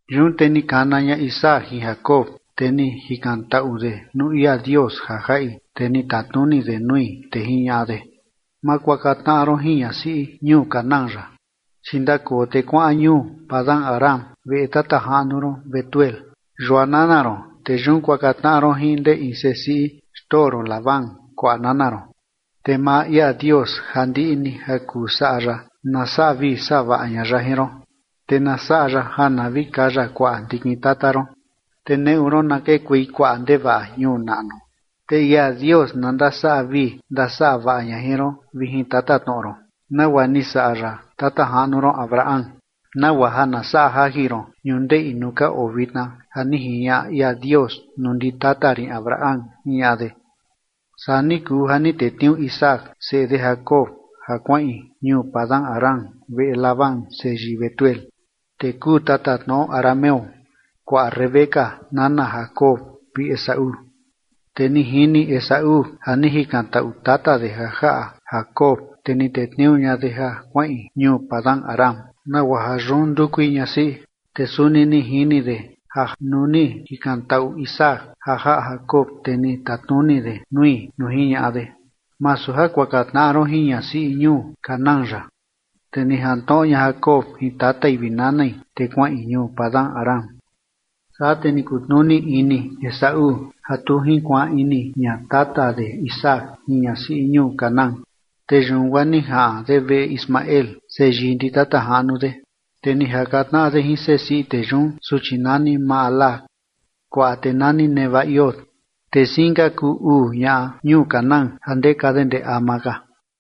Yun te ni kana ña Isaac jin Jacob, te ni jikantaꞌu de nuu ia Dios ja jaꞌi, te ni tatnuni de nui, te jiñaꞌa de: ―Ma kuaka tnaꞌa ron jin ñasiꞌi ñuu Canaán yaꞌa. Chi ndakoo te kuaꞌan ñuu Padan-aram, veꞌe tata jaꞌnu ron Betuel, yua nana ron, te yun kuaka tnaꞌa ron jin ndee in sesiꞌi xtoo ron Labán, kuaꞌa nana ron. Te maa ia Dios ja ndiꞌi ni ja kuu saꞌa ya na saꞌa vii saꞌa vaꞌa ña ya jin ron, te na saꞌa ya ja na vi kaya kuaꞌa ndikin tata ron, te neꞌu ron na kekuei kuaꞌa ndevaꞌa ñuu naꞌnu. Te ia Dios na ndasaꞌa vii ndasaꞌa vaꞌa ña jin ron vi jin tatatnoꞌo ron nagua ni saꞌa ya tata jaꞌnu ron Abraham, nagua ja na saꞌa jajin ron ñundeꞌi nuu ka oo vitna ja ni jiñaꞌa ia Dios nuu ndi tata rin Abraham ―jiñaꞌa de. Saa ni kuu ja ni tetniuu Isaac seꞌe de Jacob ja kuaꞌin ñuu Padan-aram veꞌe Labán seyii Betuel, tee kuu tatatnoꞌo arameo, kuaꞌa Rebeca, nana Jacob vi Esaú. Te ni jini Esaú ja ni jikantaꞌu tata de ja jaꞌa Jacob, te ni tetniuu ña de ja kuaꞌin ñuu Padan-aram nagua ja yun ndukui ñasiꞌi, te suni ni jini de ja nuu ni jikantaꞌu Isaac ja jaꞌa Jacob, te ni tatnuni de nui nuu jiñaꞌa de: “Masu ja kuaka tnaꞌa ron jin ñasiꞌi ñuu Canaán yaꞌa”. Te ni jantnoꞌo ña Jacob jin tatai vi nanai, te kuaꞌin ñuu Padan-aram. Saa te ni kutnuni ini Esaú ja tu jinkuaan ini ña tata de Isaac jin ñasiꞌi ñuu Canaán. Te yun guaa ni jaꞌan de veꞌe Ismael seyii ndi tata jaꞌnu de, te ni jaka tnaꞌa de jin sesiꞌi tee yun suchi nani Mahalat, kuaꞌa tee nani Nebaiot. Te siin ka kuu uu ñaꞌa ñuu Canaán ja ndeka de ndee ama ka.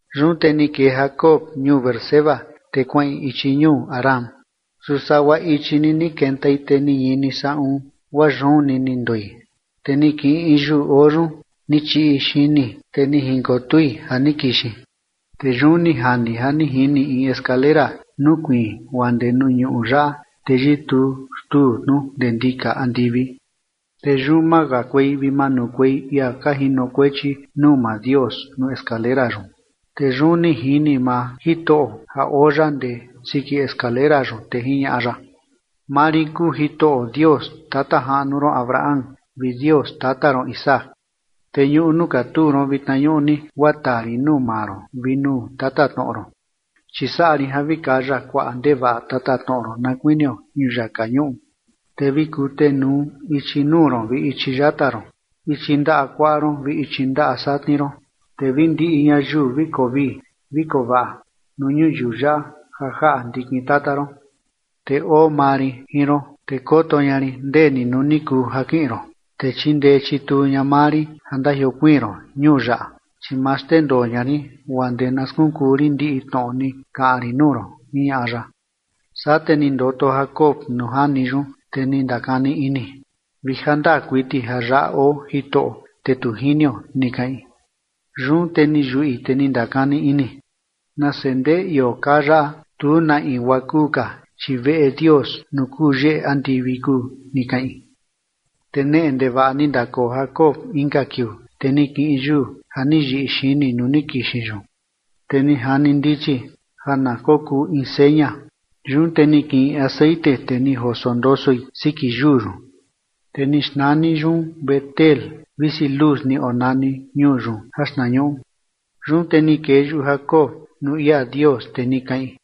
Yun te ni kee Jacob ñuu Beerseba, te kuaꞌin ichi ñuu Harán. Su sagua ichi ni ni kentai te ni ñini saꞌun, guaa yun ni ni ndoi, te ni kiꞌin in yuu oo yun ni chiꞌi xini, te jinkotui ja ni kixin. Te yun ni jani ja ni jini in escalera nukuiin guaa ndee nuu ñuꞌu yaꞌa, te yituu xtuu tnu ndee ndika andivi. Te yun makakuei vi manukuei ia ka jinokuechi nuu maa Dios nuu escalera yun. Te yun ni jini maa Jitoꞌo, ja oo ya ndee siki escalera yun, te jiñaꞌa ya: ―Maa rin kuu Jitoꞌo Dios tata jaꞌnu ron Abraham vi Dios tata ron Isaac. Te ñuꞌu nuu katuu ron vitna ñuꞌni guaa taa rin nuu maa ron vi nuu tatatnoꞌo ron. Chi saꞌa rin ja vi kaya kuaꞌa ndevaꞌa tatatnoꞌo ron na kuinio ñuyaka ñuꞌu, te vi kutenuu ichi nuu ron vi ichi yata ron, ichi ndaꞌa kuaꞌa ron vi ichi ndaꞌa satni ron, te vi ndiꞌi ñayiu vi koo vii vi koo vaꞌa nuu ñuyiu yaꞌa ja jaꞌa ndikin tata ron. Te oo maa rin jin ron, te koto ña rin ndeni nuu ni kuu ja kiꞌin ron, te chindee chituu ña maa rin ja ndajiokuiin ron ñuu yaꞌa, chi ma xndendoo ña rin guaa ndee na skunkuu rin ndiꞌi tnoꞌo ni kaꞌan rin nuu ron ―jiñaꞌa ya. Saa te ni ndoto Jacob nuu jani yun, te ni ndakani ini: “Vi ja ndaa kuiti ja yaꞌa oo Jitoꞌo, te tu jinio”, ni kaꞌin. Yun te ni yuꞌi, te ni ndakani ini: “Nase ndeꞌe ioo kaa yaꞌa, tu na in guaa kuu ka, chi veꞌe Dios nuu kuu yeꞌe andivi kuu”, ni kaꞌin. Te neꞌe ndevaꞌa ni ndakoo Jacob inka kiuu, te ni kiꞌin yuu ja ni yiꞌi xini nuu ni kixin yun, te ni jani ndichi ja na kokuu in seña, yun te ni kiꞌin texeꞌen te ni joso ndosoi siki yuu yun. Te ni xnani yun Betel visi Luz ni onani ñuu yun jaxtnañuꞌu. Yun te ni kee yuꞌu Jacob nuu ia Dios, te ni kaꞌin: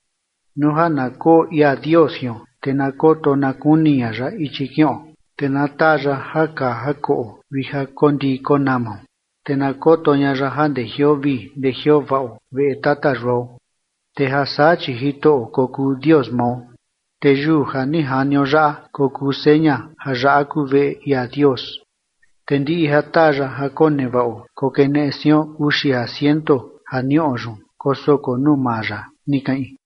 “Nuu ja na koo ia Dios jion, te na koto na kuni ña ya ichi kiꞌon, te na taa ya ja kaa ja koꞌo vi ja koo ndiꞌi ja koo namao, te na koto ña ya ja ndejioo vii ndejioo vaꞌo veꞌe tata yuao, te ja saa chi Jitoꞌo kokuu Dios mao. Te yuu ja ni janio yaꞌa kokuu seña ja yaꞌa kuu veꞌe ia Dios. Te ndiꞌi ja taa ya ja konevaꞌo kokeneꞌe sion uxi ja ciento ja niꞌo yun kosoko nuu maa ya”, ni kaꞌin.